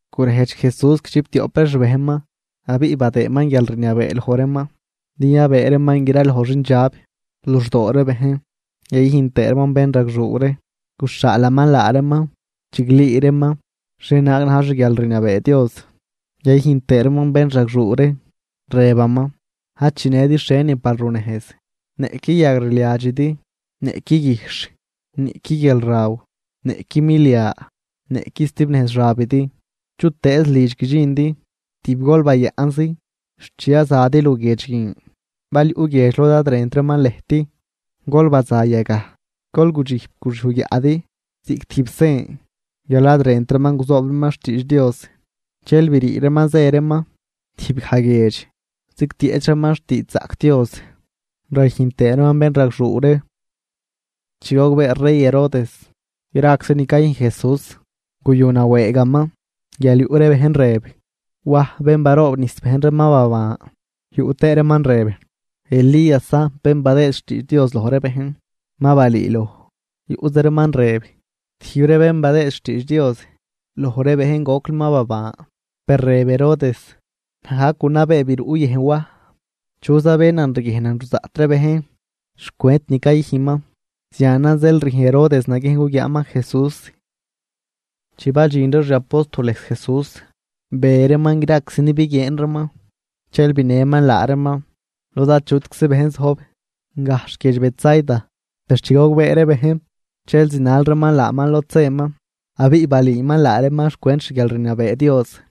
Gurejdx Jesús guidxiptioꞌp ree xbejnman, abiꞌ badëëman guialrniabee loj reeman din yabëë reeman graloj xindxab luxdoo ree bejn yayüjn tëë reeman bénragxuu ree. Guxhaalaman laa reeman chiglüü reeman xhienaag na̱j xguialrniabee Dios, yayüjn tëë reeman bénragxuu ree. Rëbaman: ―Ad chinëdi xhienin par runejz: niꞌqui yagrliadxidi, niꞌqui guijxh, niꞌqui guialraw, niꞌqui milia, niꞌqui stibnejz xabidi. Chutëëz lidx guidxindi, tib gol bayaꞌnzi xt chi yazadi luguiedx guin. Bal yuꞌ guiedx lod ad rënt reeman lëjt, gol baza yagaj, gol gudxijp guxyuj guiaꞌdi ziꞌc tijb sen guial ad rënt reeman guzoob reeman xtiidx Dios. Dxel brii reeman zë reeman tijbgaj guiedx zigtieꞌch reeman xtiidxzaꞌc Dios, rayüjn tëë reeman bénragxuu ree. Chi gogbee rey Herodes graczi ni cayüjn Jesús. Guyunawëëgaman guial yuꞌ ree bejn rëb, Waj bén baroobnijs bejn ree ma baban, yuꞌ tëë reeman rëb Elíasan bén badëë xtiidx Dios loj ree bejn ma balüüloj, yuꞌza reeman rëb, tijb ree bén badëë xtiidx Dios loj ree bejn gocli ma baban. Per rëb Herodes: ―Naj gajc gunabee biruꞌ yëjn Waj. ¿Chuza bénan riguiejnan ruzaꞌt ree bejn xcwent ni cayüjnman? Zianan zeel rüjn Herodes naguiejn guguiaaman Jesús. Chi badxin ree xi apóstoles Jesús, be reeman graczi ni biguieen reeman. Dxel binëman laa reeman lod achutczi bejn zojb, gajxh guiedx Betsaida. Per chi gogbee ree bejn, dxel zinal reeman laaman lod zëman. Abiꞌ balüüman laa reeman xcwent xguialrniabee Dios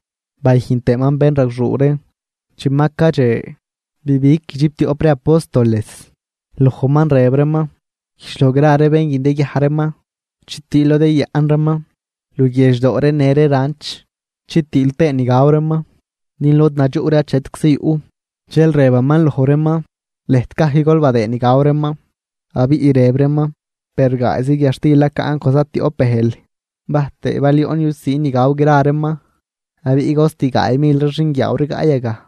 bayüjn tëëman bénragxuu ree. Chi ma cadxe, bibig guidxiptioꞌp ree apóstoles lojman rëb reeman: ―Güjdx loj gra ree bén guin din yaguiaj reeman chitiil lod yayaꞌn reeman luguiedx doo ree në ree ranch, chitiil tëë ni gaw reeman din lod nadxuꞌ ree achetczi yuꞌ. Dxel rëbaman loj reeman: ―Lëjt gajc gol badëëd ni gaw reeman. Abiꞌ rëb reeman: ―Per gaayzi guiadxtil nacaꞌn con zatioꞌp bëjl, bajtëë bal yoꞌn yusiin ni gaw gra reeman. Abiꞌ cost gaay mil ree xinguiaaw rigaꞌ yagaj.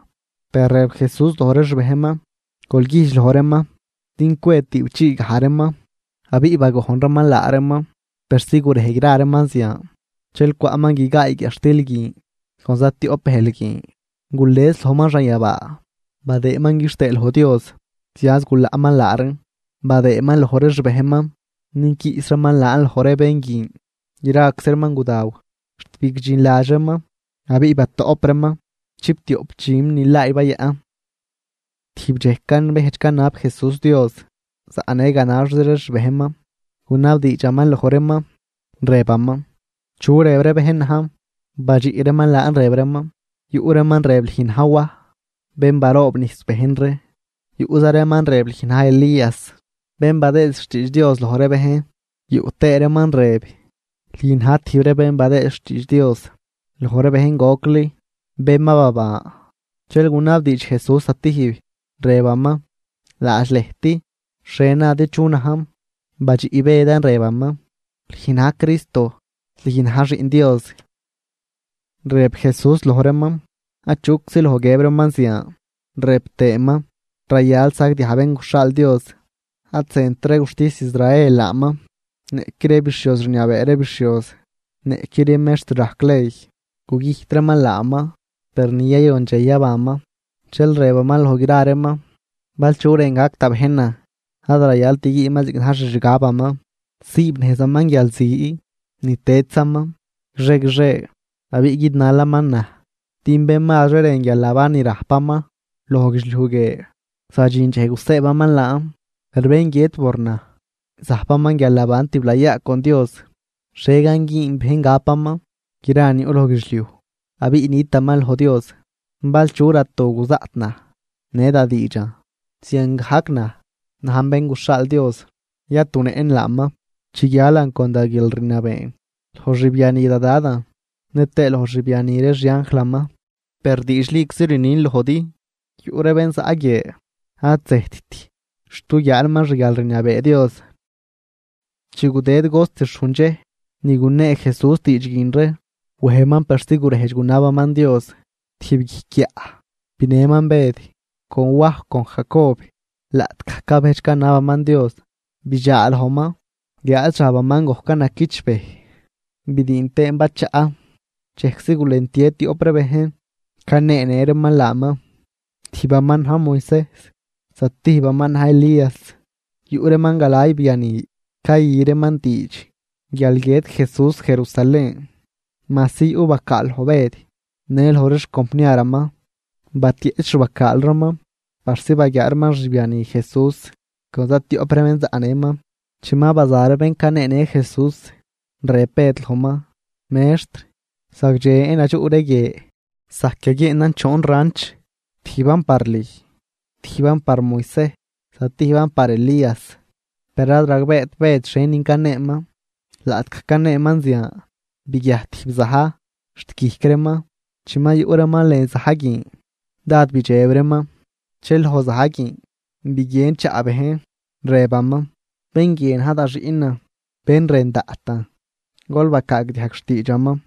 Per rëb Jesús loj ree xbejnman: ―Gol güjdx loj reeman din cwe tüꞌpchii gaj reeman. Abiꞌ bagojn reeman laa reeman persi gurej gra reeman zian. Dxel cwaꞌman guigaay guiadxtil guin con zatioꞌp bëjl guin. Gules lojman xanyabaa, badëëman quixtëë loj Dios, zianz gulaꞌman laa reen badëëman loj ree xbejnman din quiꞌs reeman laan loj ree bén guin. Graczi reeman gudaw xt bigdxinladx reeman. Abiꞌ batoꞌp reeman chiptioꞌp dxüm nilaay bayaꞌn. Tijb dxej cabejdx canab Jesús Dios, zaꞌnë ganaxzi ree xbejnman. Gunabdiidxaman loj reeman, rëbaman: ―¿Chu rëb ree bejn najn? Badxiꞌ reeman laan rëb reeman: ―Yuꞌ reeman rëb lüj na̱j Waj bén baroobnijs bejn ree, yuꞌza reeman rëb lüj na̱j Elías bén badëë xtiidx Dios loj ree bejn, yuꞌ tëë reeman rëb lüj na̱j tijb ree bén badëë xtiidx Dios loj ree bejn gocli, bén ma baban. Dxel gunabdiidx Jesús zatijb, rëbaman: ―Laadx lëjt, ¿xhie nadi chu najn? Badxiꞌ Bëdan rëbaman: ―Lüj na̱j Cristo. Lüj na̱j Xiꞌn Dios. Rëb Jesús loj reeman achuczi loj guiëb reeman zian, rëb tëëman: ―Rayal sagdiaj Bén guxhaal Dios: ad zënt ree guxtis Israel laaman, niꞌqui ree bixhioz rniabee ree bixhioz, niꞌqui ree mextr rajc ley. Gugüjt reeman laaman, per ni yayon dxej yabanman. Dxel rëbaman loj gra reeman: ―Bal chu rën gac da bejnan ad rayalt güünman ziꞌc na̱j xixgabaman, siibnejzaman guialzi ni tëdzaman guixie guixie abiꞌ guidnalaman naj. Din bén mazri rën guialnaban ni rajpaman loj guidxliuj guie, zadxin dxej gusëëbaman laan, per bén guiët por naj, zajpaman guialnaban tiblayaa con Dios. ¿Xhie gan güün bejn gapaman gra ni yuꞌ loj guidxliuj abiꞌ nitaman loj Dios? Bal chu ratu guzaꞌt naj në da diidxan, ziangajc naj najn Bén guxhaal Dios, yatunëꞌn laaman chi guialan con da guialrniabeen loj xbiani da Dadan nëtëë loj xbiani ree xianjlaman. Per diidxliczi rnin lojdi, yuꞌ ree bén zaꞌ guie ad zëjtt xt guguiaa reeman xguialrniabee Dios. Chi gudëd cost xhujn dxej ni gunee Jesús diidx guin ree, wejman persi gurejdx gunabaman Dios tijb guijc guiaꞌ, binëman Bëd con Waj con Jacob. Laꞌtgaj cabejdx canabaman Dios, bidxaa lojman guiáad xabaman gojcan naquichbëj bidiin tëën bachaꞌ. Dxejczi gulentie tioꞌp ree bejn, caneenë reeman laaman. Tijbaman na̱j Moisejs zatijbaman na̱j Elías. Yuꞌ reeman galay biani cayü reeman diidx guial guiët Jesús Jerusalén. Majsi yuꞌ bacaal loj Bëd në loj ree xcompniaraman, batieꞌch xbacaal reeman persi baguiaa reeman xbiani Jesús con zatioꞌp ree bén zaꞌnëman. Chi ma baza ree bén caneenë Jesús, rëb Bëd lojman: ―Mextr, ¡zagdxen nadxuꞌ ree guie! Zajc yaguieenan choon ranch, tijban par lüj, tijban par Moisejs zatijban par Elías. Per ad ragbeet Bëd xhienin caneeman. Laꞌtgaj caneeman zian, biguiajt tijb za̱j xt guijc reeman, chi ma yuꞌ reeman lën za̱j guin dád bidxeb reeman. Dxel loj za̱j guin biguien chaꞌ bejn, rëbaman: ―Bén guie na̱j da Xiꞌnan bén rën daꞌtan. Gol bacaagdiajg xtiidxaman.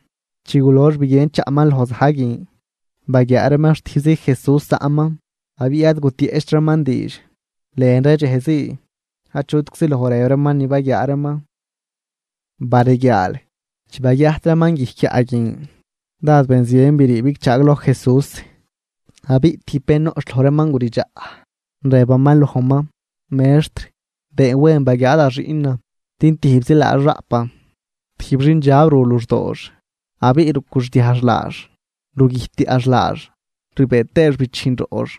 Chi gulox biguien chaꞌman loj za̱j guin, baguiaa reeman xtijbzi Jesús zaꞌman. Abiꞌ ad gutieꞌcht reeman diidx. Lën ree dxej zii achutczi loj rëb reeman ni baguiaa reeman. Bareguiaal, chi baguiajt reeman guijc guiaꞌ guin, dád benzien brii bigchaagloj Jesús. Abiꞌ tijb bén noꞌch loj reeman guridxaꞌ, rëbaman lojman: ―¡Mextr!, been wen baguiaa da xiꞌnan din tijbzi laax raꞌpan. Tijb xindxab ru luxdoox abiꞌ rucwixdiajx laax, rugüjtyaꞌx laax rbëë tëëx bichijn roꞌx.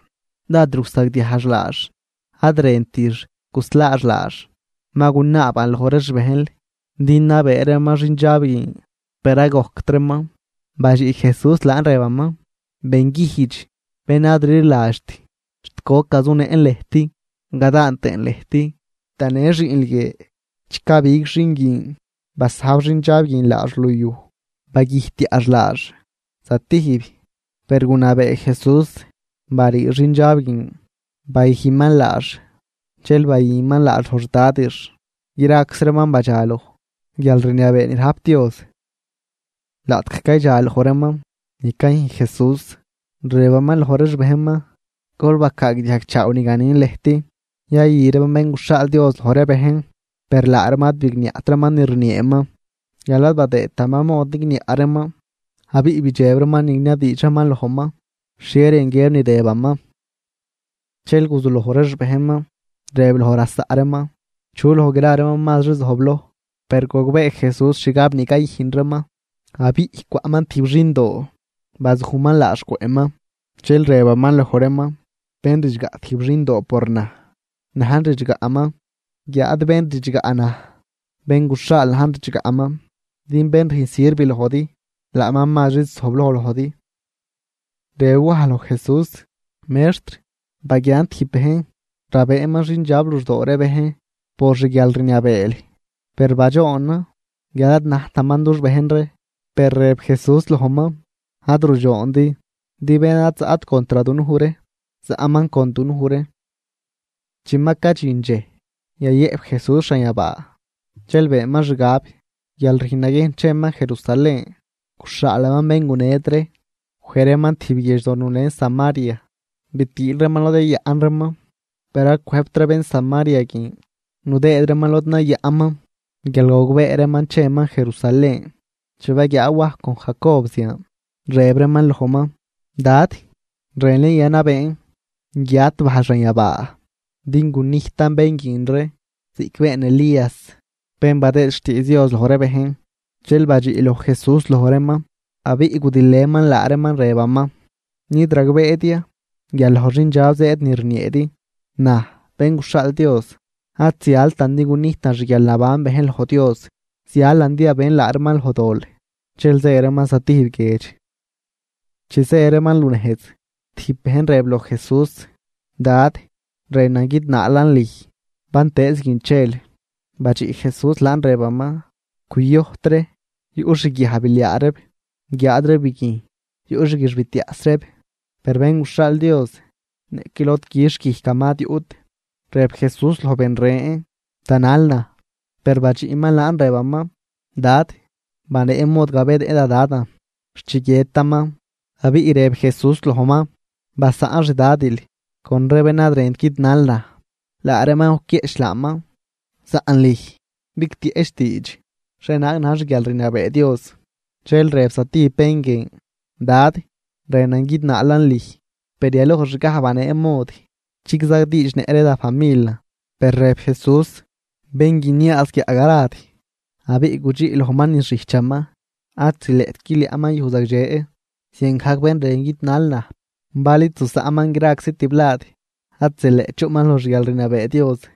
Dád rusagdiajx laax ad rëntix guslaax laax. Ma gunaaban loj ree xbejnl din nabëë reeman xindxab guin, per ad gojct reeman. Badxiꞌ Jesús laan rëbaman: ―¡Benguijdx, bén ad rliladxt! ¿Xt goc gazunëꞌn lëjt gadaan tëën lëjt? Tanë xiꞌnl guie. Chi cabig xin guin basajb xindxab guin laax luyuj, bagüjtyaꞌx laax zatijb. Per gunabee Jesús barii xindxab guin, bayüjnman laax dxel bayüman laax loj xdadix. Graczi reeman badxaloj guialrniabee ni rajp Dios. Laꞌtgaj caydxa loj reeman ni cayüjn Jesús, rëbaman loj ree xbejnman: ―Gol bacaagdiajgchaaw ni ganin lëjt: yayü reeman Bén guxhaal Dios loj ree bejn. Per laa reeman ad bigniaꞌt reeman ni rnieeman guial ad badëëtaman mod nigniaꞌ reeman, abiꞌ bidxeb reeman niniabdiidx reeman lojman xhie rën guiëb ni rëbaman. Dxel guzuloj ree xbejnman rëb loj lasaꞌ reeman chu loj gra reeman mazri zojbloj. Per gogbee Jesús xgab ni cayüjn reeman abiꞌ cwaꞌman tijb xindoo, bazujman laax cwëꞌman, dxel rëbaman loj reeman: ―Bén ridxgaꞌ tijb xindoo por naj, najn ridxgaꞌman, guiáad bén ridxgaꞌ naj, bén guxhaal najn ridxgaꞌman. Din bén rüjn sirv lojdi, laaman mazri zojbloj lojdi. Rëb Waj loj Jesús: ―Mextr, baguiaan tijb bejn rabëëman xindxab luxdoo ree bejn por xguialrniabeel. Per badxoonan guial ad najtaman dux bejn ree. Per rëb Jesús lojman: ―Ad rudxoondi, din bén ad zaꞌt contr dunuj ree, zaꞌman con dunuj ree. Chi ma cadxin dxej yayëꞌp Jesús xanyabaa, dxel beenman xgab guial rüjn naguiejn cheman Jerusalén. Guxhaalaman bén guned ree, wej reeman tijb guiedxdo nulen Samaria bitiil reeman lod yayaꞌn reeman. Per ad cwëjbt ree bén Samaria guin nudëëd reeman lod nayaꞌnman guial gogbee reeman cheman Jerusalén. Chi baguiaa Waj con Jacob zian, rëb reeman lojman: ―Dad, ¿rënl ya yanabeen guiat bajl xanyabaa din gunijtan bén guin ree ziꞌc been Elías bén badëë xtiidx Dios loj ree bejn? Dxel badxiꞌ loj Jesús loj reeman, abiꞌ gudilëman laa reeman rëbaman: ―¿Nid ragbeedi ya guial loj xindxab zëëd ni rnieedi? Naj, Bén guxhaal Dios, ad zialtan din gunijtan xguialnaban bejn loj Dios, zialan din yabën laa reeman loj dol. Dxel zë reeman zatijb guiedx. Chi zë reeman lunejz, tijb bejn rëb loj Jesús: ―Dad, rënan guidnaalan lüj bantëëz guin chel. Badxiꞌ Jesús laan rëbaman: ―Cuyojt ree yuꞌ xguiajbiliaa reeb guiáad ree biguijn yuꞌ xguixbitiaꞌs reeb. Per Bén guxhaal Dios niꞌqui lod quixh guijcaman ad yuꞌt. Rëb Jesús loj ben ren: ―Tanal naj. Per badxiꞌman laan rëbaman: ―Dad, banee mod gabenëꞌ da Dadan xt chi guiëtaman. Abiꞌ rëb Jesús lojman: ―Basaꞌn xdadil con ree bén ad rënt guidnal naj, laa reeman guquieꞌch laaman. Saꞌn lüj bigtieꞌch diidx xhienaag na̱j xguialrniabee Dios. Dxel rëb zatijb bén guin: ―Dad, rënan guidnaalan lüj, per yalojxgaj banee mod chigzadiidxnëꞌ ree da familan. Per rëb Jesús: ―Bén guiniaaz guiaꞌ garad abiꞌ gudxiꞌ lojman niz xijchaman, ad zileꞌt guiliaꞌman yuj zagdxe. Ziangajc bén rën guidnal naj, bal id zusaꞌnman graczi tiblad ad zileꞌt chuꞌman loj xguialrniabee Dios.